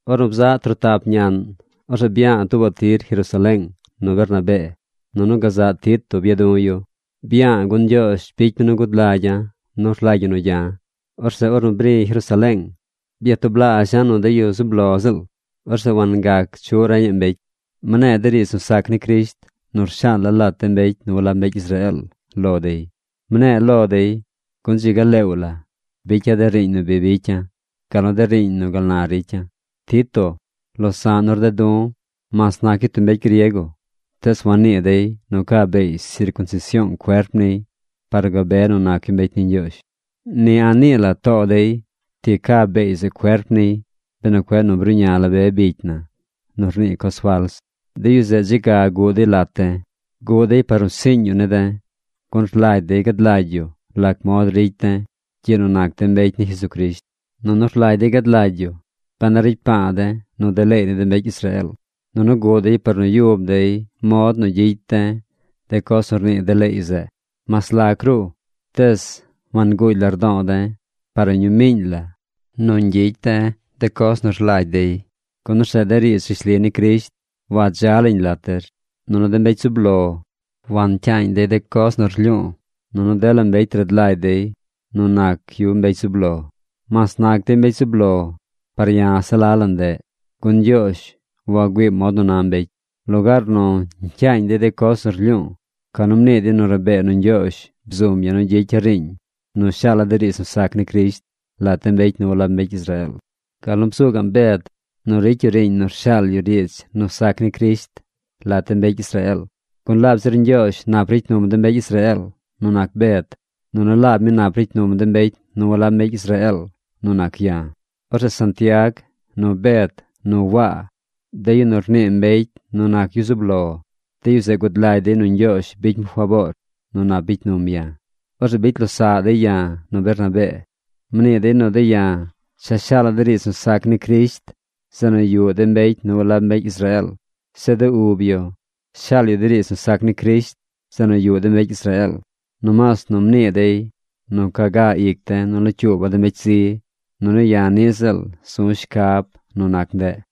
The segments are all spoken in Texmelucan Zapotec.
Ornu bzaꞌ trotap ñaꞌn, orzeꞌ bya̱a̱ tuubaꞌ tir Jerusaleeng nu Bernabee. Nunu gazaꞌ Tito bya du̱ yu. Bya̱a̱ gun Ñgyoozh bicy mi nu gud lagya̱ nu rlagy ñi nu gya̱. Orzeꞌ ornu bri̱ Jerusaleeng, byatublaazha̱ nu de yu zub lo ziꞌl. Orzeꞌ wangac chuꞌ reñaꞌ mbecy. Mne̱e̱ de riidz nu sac ni Crisht nu rshaala̱ lat de mbecy nu walab mbecy Israeel lo dey. Mne̱e̱ lo dey, gun dzi ga leew la bicya̱ de riiñ nu bi bicya̱, gal nu de riiñ nu gal na ricya̱. Tito, losa̱ꞌ nu rded du̱, mas nac yu tub mbecy griego, tees wannii dey nu ca beey sircunsision cuerp niy par nu gabe nu nac yu mbecy ni Ñgyoozh. Ni a̱ꞌ nii la too dey ti ca beey zeꞌ cuerp niy benu cueꞌ nu bruꞌña la be bicy na nu rnii coz fals. De yu zeꞌ dze ga guꞌ dey lat de̱. Guꞌ dey par nu siiñ yu ne̱ de̱, gun rlagy dey gad lagy yu lac mod ricy de̱ gyiꞌ nu nac de̱ mbecy ni Jesucrisht. Nunu rlagy dey gad lagy yu ben a ricy pa̱a̱ de̱ nu de leey ni de mbecy Israeel. Nunu guꞌ dey par nu yub dey mod nu gyicy de̱ de coz nu rnii de leey zeꞌ. Mas lac ruꞌ, tees wanguugy lardo̱o̱ de̱ par ni ñuu miiñ la nu ñgyicy de̱ de coz nu rlagy dey, gun orzeꞌ de riidz rishli ni Crisht wadza lañ lat der. Nunu de mbecy zub lo, wancyaañ dey de coz nu lyu̱u̱, nunu dela mbecy rad lagy dey nu nac yu mbecy zub lo. (Mas nac dey mbecy zub lo, par ya̱ se la la ndeꞌ, gun Ñgyoozh wagüiim mod nu na mbecy.) Lugaar nu ñcyaañ dey de coz nu rlyu̱u̱, ca nu mnii dey nu rabee nu Ñgyoozh bzum ya̱ nu gyicya̱ riiñ nu shaala̱ de riidz nu sac ni Crisht lat de mbecy nu walab mbecy Israeel, gal nu bzu gaꞌm Bed nu ricy yu riiñ nu rshaal yu riidz nu sac ni Crisht lat de mbecy Israeel. Gun laab zir Ñgyoozh nap ricy num de mbecy Israeel nu nac Bed, nunu laab mi nap ricy num de mbecy nu walab mbecy Israeel nu nac ya̱. Orzeꞌ Santiag, nu Bed, nu Waa, de yu nu rnii mbecy nu nac yu zub lo, de yu zeꞌ gud lagy dey nu Ñgyoozh bicy mi faboor nu nap bicy num ya̱. Orzeꞌ bicy losaꞌ dey ya̱ nu Bernabee. Mnii dey nu de̱ ya̱ cha shaala̱ de riidz nu sac ni Crisht zeꞌ nu yuꞌ de mbecy nu walab mbecy Israeel. Zeꞌ de ub yu shaal yu de riidz nu sac ni Crisht zeꞌ nu yuꞌ de mbecy Israeel. Nomaas nu mnii dey nu ca ga ic de̱ nu locyuuba̱ de mbecy zi. Nunu ya̱ niꞌ ziꞌl zu̱ shcab nu nac ndeꞌ.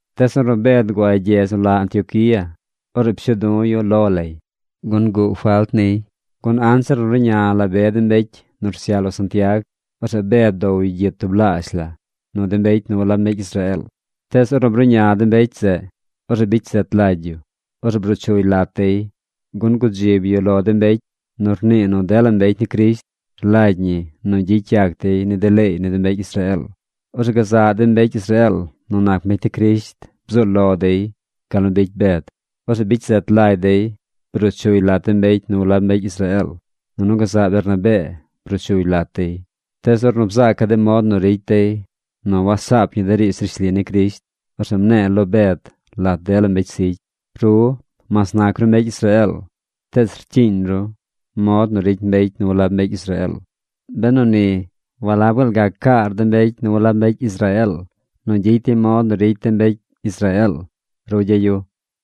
Tees ornu Bed guay gyedz nu la Antioquía, orzeꞌ pshuu du̱ yu lo lay, gun yuꞌ falt niy. Gun anzir nu ruꞌña la be de mbecy nu rsyaꞌ lo Santiag, orzeꞌ Bed bdow yu gyit tublaazh la nu de mbecy nu walab mbecy Israeel. Tees ornu bruꞌña de mbecy zeꞌ, orzeꞌ bicy zet lagy yu. Orzeꞌ bruu chuy lat dey, gun gudzib yu lo de mbecy nu rnii nu dela mbecy ni Crisht rlagy ñi nu gyicy yac dey ni de leey ni de mbecy Israeel. Orzeꞌ gazaꞌ de mbecy Israeel nu nac mbecy ni Crisht bzuu lo dey gal nu bicy Bed. Orzeꞌ bicy zet lagy dey bruu chuy lat de mbecy nu walab mbecy Israeel, nunu gazaꞌ Bernabee bruu chuy lat dey. Tees ornu bzaca̱ de mod nu ricy dey nu wasaap ñi de riidz rishli ni Crisht, orzeꞌ mne̱e̱ lo Bed lat dela mbecy zigy: “Ru, mas nac ru mbecy Israeel, tees rcyiiñ ru mod nu rcyiiñ mbecy nu walab mbecy Israeel. Benu ni, ¿walab gaal gac caar de mbecy nu walab mbecy Israeel nu gyicy dey mod nu ricy de mbecy Israeel?” rugya̱ yu.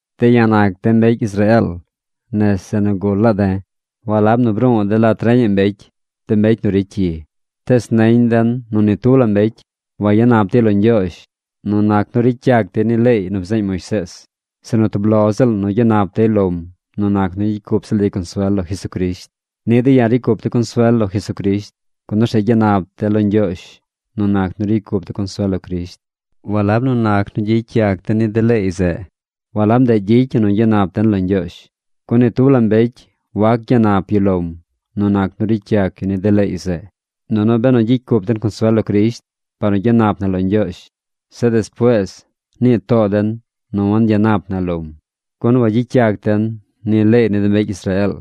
De̱ ya̱ nac de̱ mbecy Israeel nese nu gul la̱a̱ de̱. Walab nu bru̱u̱ de̱ lat reñaꞌ mbecy, de mbecy nu ricy cyi. Tees neñ den nu ni tub la mbecy wayanap dey lo Ñgyoozh nu nac nu ricy yac dey ni leey nu bzeeñ Moisees, sinu tub lo ziꞌl nu gyanap dey lom nu nac nu gyicy cup ziꞌl dey consuel lo Jesucrisht. Niꞌ de̱ ya̱ ricy cup de̱ consuel lo Jesucrisht, gun orzeꞌ gyanap de̱ lo Ñgyoozh nu nac nu ricy cup de̱ consuel lo Crisht. Walab nu nac nu gyicy yac de̱ ni de leey zeꞌ. Walab ndeꞌ gyicy ñi nu gyanap den lo Ñgyoozh. Gun ni tub la mbecy wac gyanap yu lom nu nac nu ricy yac yu ni de leey zeꞌ. Nunu benu gyicy cup den consuel lo Crisht par nu gyanap na lo Ñgyoozh, zeꞌ despuees nii too den nu wangyanap na lom, gun wagyicy yac den ni leey ni de mbecy Israeel,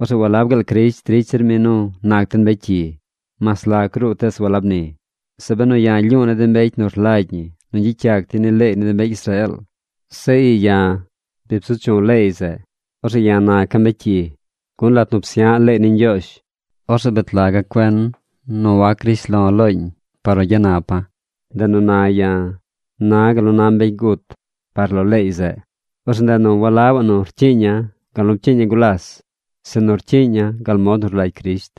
orzeꞌ ¿walab gaal Crisht ricy zir mi nu nac den mbecy cyi? ¡Mas lac ruꞌ tees walab ni! Zeꞌ benu ya̱ lyu̱u̱ ni de mbecy nu rlagy ñi nu gyicy yac dey ni leey ni de mbecy Israeel, zeꞌ ii ya̱ bi bzu chu̱ leey zeꞌ, orzeꞌ ya̱ naca̱ mbecy cyi. Gun lat nu psya̱ꞌ leey ni Ñgyoozh, orzeꞌ bet laga̱ cuen nu wac grish lo̱ looñ par nu gyanapa̱. Ndeꞌ nu na ya̱ na̱ gal nu na mbecy gut par lo leey zeꞌ. Orzeꞌ ndeꞌ nu walabaꞌ nu rcyiiña̱ gal nu pcyiiña̱ gulas, sinu rcyiiña̱ gal mod nu rlagy Crisht.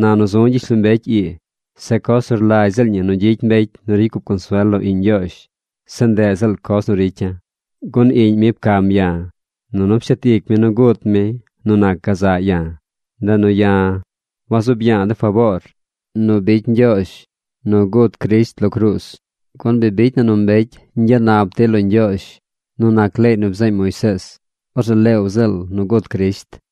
Na nu zu̱ gyishlombecy ii, se coz nu rlagy ziꞌl ñi nu gyicy mbecy nu ricy cup consuel lo iꞌñ Ñgyoozh, se ndeꞌ ziꞌl coz nu ricya̱. Gun iꞌñ mi pcam ya̱, nunu pshet ic mi nu gut mi nu nac gazaꞌ ya̱. Ndeꞌ nu ya̱ wazuub ya̱a̱ de faboor nu bicy Ñgyoozh nu gut Crisht lo cruuz, gun bi bicy na nu mbecy ñgyanap dey lo Ñgyoozh nu nac leey nu bzeeñ Moisees, orzeꞌ leew ziꞌl nu gut Crisht.